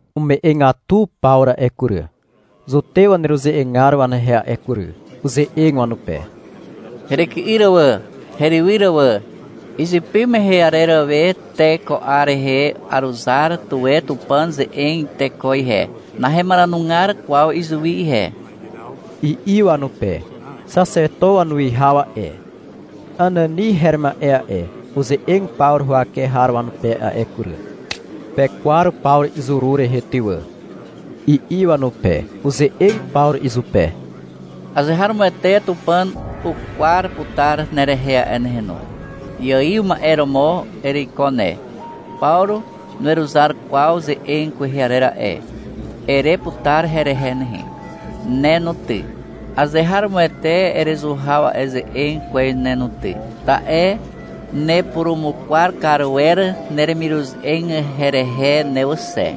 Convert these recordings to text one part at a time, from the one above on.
Ume'egatu Pawru a'e kury, zutew waneruze'egar wanehe a'e kury. Uze'eg wanupe. — Heryky'yr wà, herywyr wà. Izypy mehe arer we te ko 'ar rehe aruzar tuwe Tupàn ze'eg teko ihe. Nahemaranugar kwaw izuwi ihe, i'i wanupe. Xaxeto wanuwihaw a'e, Anani her ma'e a'e, uze'eg Pawru huwake har wanupe a'e kury. — Pekwar Pawru izuru rehe ty wà, i'i wanupe. Uze'eg Pawru izupe. — Azeharomoete Tupàn ukwar putar nerehe a'e nehe no. Iaiw ma'e romo ereiko ne. — Pawru nuweruzar kwaw ze'eg kwehe arer a'e, ere putar herehe nehe. Ne no ty, azeharomoete erezuhaw a'e ze'eg kwez ne no ty, ta'e nepurumukwar kar wer neremiruze'eg herehe ne wà xe,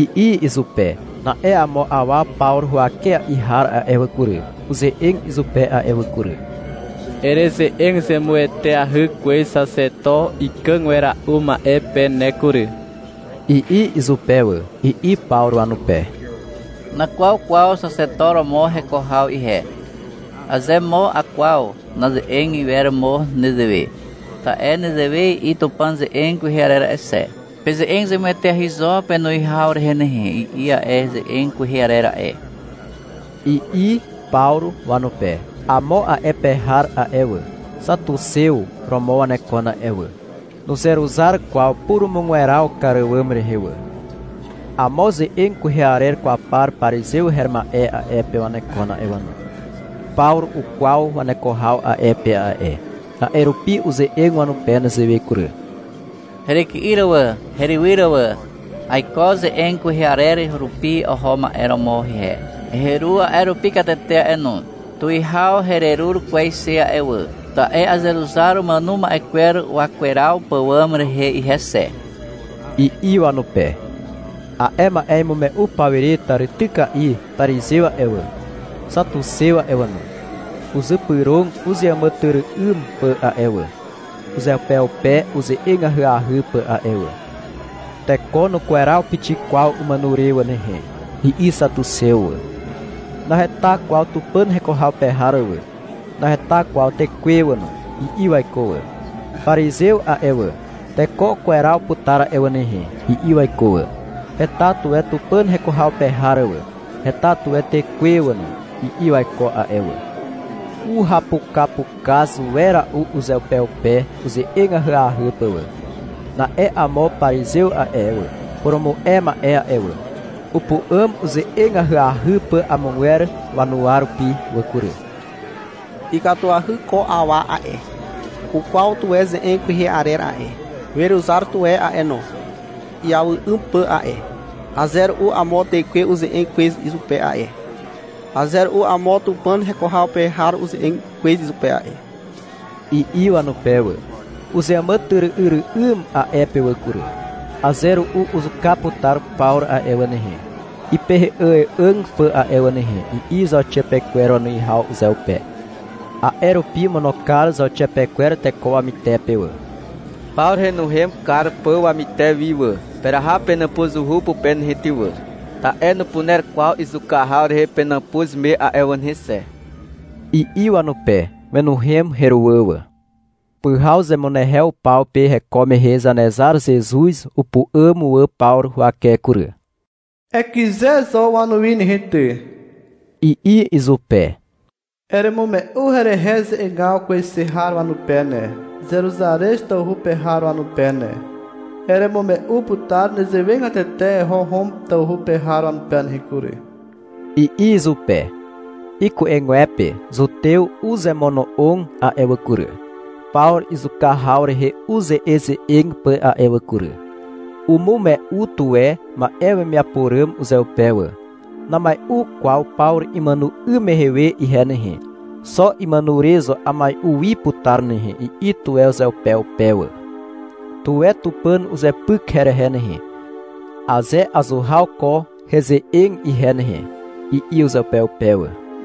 i'i izupe. Na'e amo awa Pawru huwakea'i har a'e wà kury, uze'eg izupe a'e wà kury. — Ereze'eg zemueteahy kwez Xaxeto ikàg wera'u ma'e pe ne kury, i'i izupe wà. I'i Pawru wanupe, — Nakwaw kwaw xaxeto romo heko haw ihe. Aze mo akwaw, naze'eg iwer mo nezewe. Ta'e nezewe i'i Tupàn ze'eg kwehe arer a'e xe. — Peze'eg zemueteahy zo penuwihaw rehe nehe, i'i a'e ze'eg kwehe arer a'e, i'i Pawru wanupe. Amo a'e pe har a'e wà, xatuxew romo wanekon a'e wà. Nuzeruzar kwaw purumugweraw kar àwàm rehe wà. Amo ze'eg kwehe arer kwaw par parizew her ma'e a'e pe wanekon a'e wà no. Pawru ukwaw waneko haw a'e pe a'e. A'e rupi uze'eg wanupe nezewe kury. — Heryky'yr wà herywyr wà. Aiko ze'eg kwehe arer rupi oho ma'e romo ihe. Heru a'e rupi katete a'e no. Tuwihaw hererur kwez xe a'e wà, ta'e azeruzar umàno ma'e kwer wakweraw pàwàm rehe ihe xe, i'i wanupe. A'e ma'e imume'u pawire tàrityka'i parizew a'e wà, xatuxew a'e wà no, uzypyrog uzeàmàtyry'ym pà a'e wà, uzeupeupe uze'eg ahyahy pà a'e wà. — Teko nukweraw pixik kwaw umàno re wà nehe, i'i xatuxew wà. — Naheta kwaw Tupàn heko haw pe har wà, naheta kwaw tekwe wà no, i'i waiko wà. Parizew a'e wà, — Teko ukweraw putar a'e wà nehe, i'i waiko wà. — Heta tuwe Tupàn heko haw pe har wà, heta tuwe tekwe wà no, i'i waiko a'e wà. Uhapukapukaz wera'u uzeupeupe uze'eg ahyahy pà wà. Na'e amo parizew a'e wà, purumu'e ma'e a'e wà, upu'àm uze'eg ahyahy pà amogwer wanuwa rupi wà kury. — Ikatuahy ko awa a'e. Ukwaw tuwe ze'eg kwehe arer a'e, weruzar tuwe a'e no, iawy 'ym pà a'e. Aze ru'u amo tekwe uze'eg kwez izupe a'e. Aze ru'u amo Tupàn heko haw pe har uze'eg kwez izupe a'e, i'i wanupe wà. Uzeàmàtyry'yry'ym a'e pe wà kury. — Aze ru'u uzuka putar Pawru a'e wà nehe, ipei'ài'àg pà a'e wà nehe, i'i zauxiapekwer wanuwihaw uzeupe. A'e rupi omono kar zauxiapekwer teko wamytepe wà, Pawru henuhem kar pà wamyter wi wà. — Peraha penàpuzuhu pupe nehe ty wà, (ta'e nupuner kwaw izuka haw rehe penàpuz me a'e wà nehe xe), i'i wanupe. (Wenuhem heruwà wà.) Pyhaw zemunehew paw pe heko mehe Zanezar Zezuz upu'àm wà Pawru huwake kury. Ekyze zo wanuwi nehe ty, i'i izupe. — Eremume'u herehe ze'egaw kwez xe har wanupe ne, Zeruzarez tawhu pe har wanupe ne. Eremume'u putar nezewegatete eho Hom tawhu pe har wanupe nehe kury, i'i izupe. Iku'egwepe zutew uzemono'og a'e wà kury, Pawru izuka haw rehe uze'eze'eg pà a'e wà kury. Umume'u tuwe ma'e wemiapo ràm uzeupe wà. — Namai'u kwaw Pawru imàno 'ym mehe we ihe nehe, xo imàno re zo amai'u wi putar nehe, i'i tuwe uzeupeupe wà. — Tuwe Tupàn uzepyk herehe nehe, aze azuhaw ko heze'eg ihe nehe, i'i uzeupeupe wà.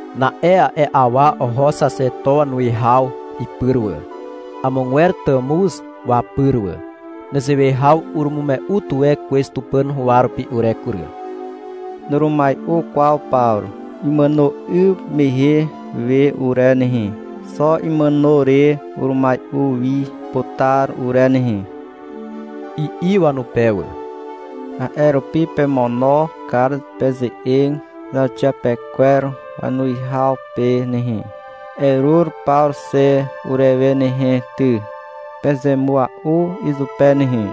Na'e a'e awa oho xaxeto wanuwihaw ipyr wà, amogwer tàmuz wapyr wà. — Nezewe haw urumume'u tuwe kwez Tupàn huwa rupi ure kury. Nurumai'u kwaw Pawru imàno 'ym mehe we ure nehe. Xo imàno re urumai'u wi putar ure nehe, i'i wanupe wà. — A'e rupi pemono kar peze'eg zauxiapekwer wanuwihaw pe nehe. — Erur Pawru xe urewe nehe ty, peze mua'u izupe nehe,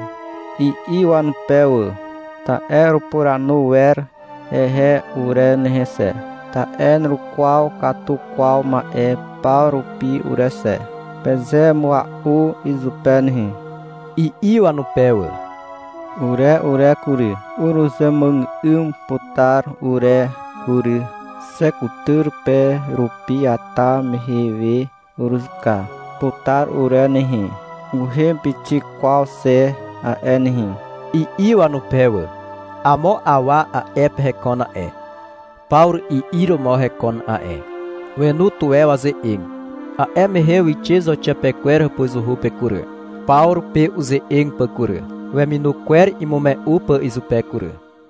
i'i wanupe wà. — Ta'e urepuranu wer hehe ure nehe xe, ta'e nurukwaw katu kwaw ma'e paw rupi ure xe, peze mua'u izupe nehe, i'i wanupe wà. — Ure ure kury, uruzemuàgà'ym putar ure kury. Xe kutyr pe rupi iata mehe we uruzuka putar ure nehe, nuhem pixik kwaw xe a'e nehe, i'i wanupe wà. Amo awa a'e pe hekon a'e, Pawru i'ir romo hekon a'e. Wenu tuwe waze'eg. A'e mehe wixe zauxiapekwer hàpuzuhu pe kury, Pawru pe uze'eg pà kury, weminu kwer imume'u pà izupe kury.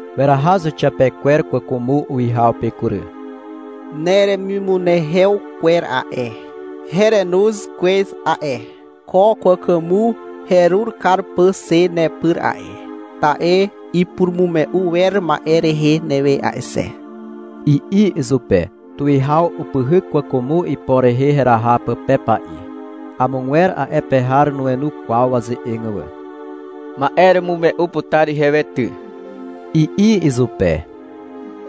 Weraha zauxiapekwer kwàkwàmo uwihaw pe kury. — Neremimunehew kwer a'e, herenoz kwez a'e, ko kwàkwàmo herur kar pà xe nepyr a'e. Ta'e ipurumume'u wer ma'e rehe newe a'e xe, i'i izupe. Tuwihaw upyhyk kwàkwàmo ipo rehe heraha pà pepa'i. Amogwer a'e pe har nuenu kwaw waze'eg wà. — Ma'e eremume'u putar ihewe ty, i'i izupe.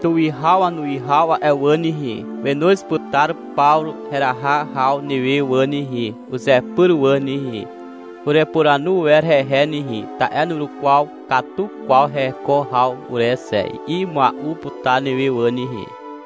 — Tuwihaw wanuwihaw a'e wà nehe, wenoz putar Pawru heraha haw newe wà nehe, uzepyr wà nehe. — Urepuranu wer hehe nehe, ta'e nurukwaw katu kwaw heko haw ure xe, i'i mua'u putar newe wà nehe.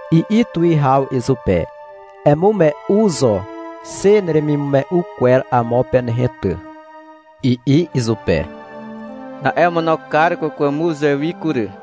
I'i tuwihaw izupe. — Emume'u zo xe neremimume'u kwer amo pe nehe ty, i'i izupe. Na'e omono kar kwàkwàmo uzewi kury.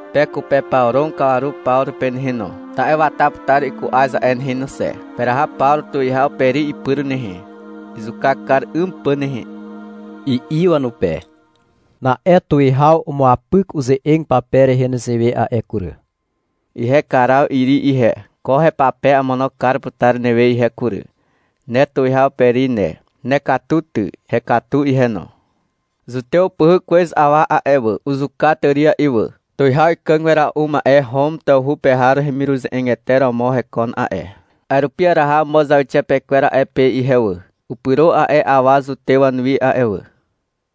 Pekupepawrog kawaru Pawru pe nehe no, ta'e wata putar iku'az a'e nehe no xe. Peraha Pawru tuwihaw Peri ipyr nehe, izuka kar 'ym pà nehe, i'i wanupe. Na'e tuwihaw umuapyk uze'eg pape rehe nezewe a'e kury. — Ihe Karaw Iri ihe, ko hepape amono kar putar newe ihe kury. Ne tuwihaw Peri ne. Nekatu ty. Hekatu ihe no. Zutew upyhyk kwez awa a'e wà. Uzuka tària'i wà. Tuwihaw ikàg wera'u ma'e Hom tawhu pe har hemiruze'egete romo hekon a'e. A'e rupi araha amo zauxiapekwer a'e pe ihe wà. Upyro a'e awa zutew wanuwi a'e wà.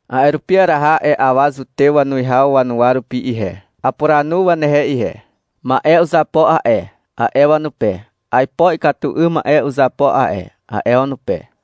A'e rupi araha a'e awa zutew wanuwihaw wanuwa rupi ihe. Apuranu wanehe ihe. — Ma'e uzapo a'e, a'e wanupe. — Aipo ikatu 'ym ma'e uzapo a'e, a'e wanupe.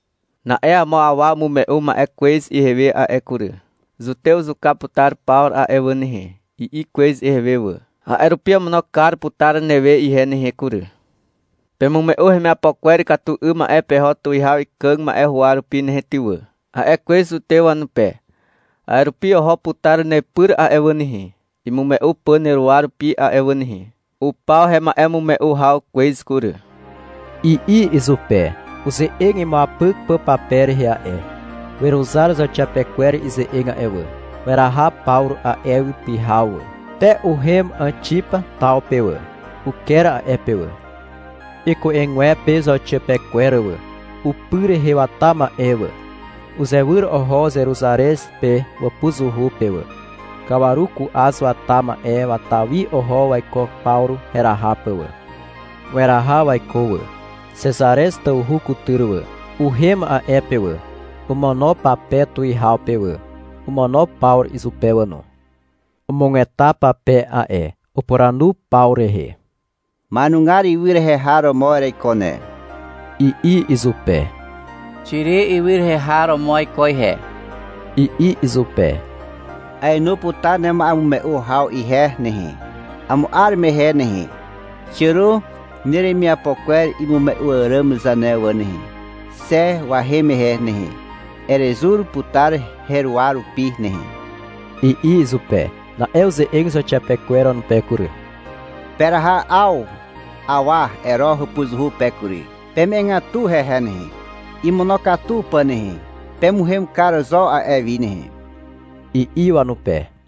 Na'e amo awa umume'u ma'e wà kwez ihewe a'e kury. — Zutew uzuka putar Pawru a'e wà nehe, i'i kwez ihewe wà. A'e rupi amono kar putar newe ihe nehe kury. — Pemume'u hemiapo kwer ikatu 'ym ma'e peho tuwihaw ikàg ma'e huwa rupi nehe ty wà, a'e kwez zutew wanupe. A'e rupi oho putar nepyr a'e wà nehe, imume'u pà neruwa rupi a'e wà nehe. Upaw hema'emume'u haw kwez kury, i'i izupe, uze'eg imuapyk pà pape rehe a'e. Weruzar zauxiapekwer ize'eg a'e wà. Weraha Pawru a'e wi pyhaw wà. Te uhem Àxipa taw pe wà. (Uker a'e pe wà.) Iku'egwepe zauxiapekwer wà, upy rehe wata ma'e wà, uzewyr oho Zeruzarez pe wàpuzuhu pe wà. Kawaru ku'az wata ma'e wata wi oho waiko Pawru heraha pà wà. Weraha waiko wà, Xezarez tawhu kutyr wà. Uhem a'e pe wà. Omono pape tuwihaw pe wà. Omono Pawru izupe wà no. Umugeta pape a'e. Upuranu Pawru rehe. — Ma'enugar ywy rehe har romo ereiko ne, i'i izupe. — Xiri ywy rehe har romo aiko ihe, i'i izupe. — Aenu putar nema'emume'u haw ihe nehe, amo 'ar mehe nehe. Xiàro neremiapo kwer imume'u àràm zane wà nehe. Xe wahem mehe nehe, erezur putar heruwa rupi nehe, i'i izupe. Na'e uze'eg zauxiapekwer wanupe kury. — Peraha 'aw awa Ero hàpuzuhu pe kury. Peme'egatu hehe nehe, imonokatu pà nehe. Pemuhem kar zo a'e wi nehe, i'i wanupe.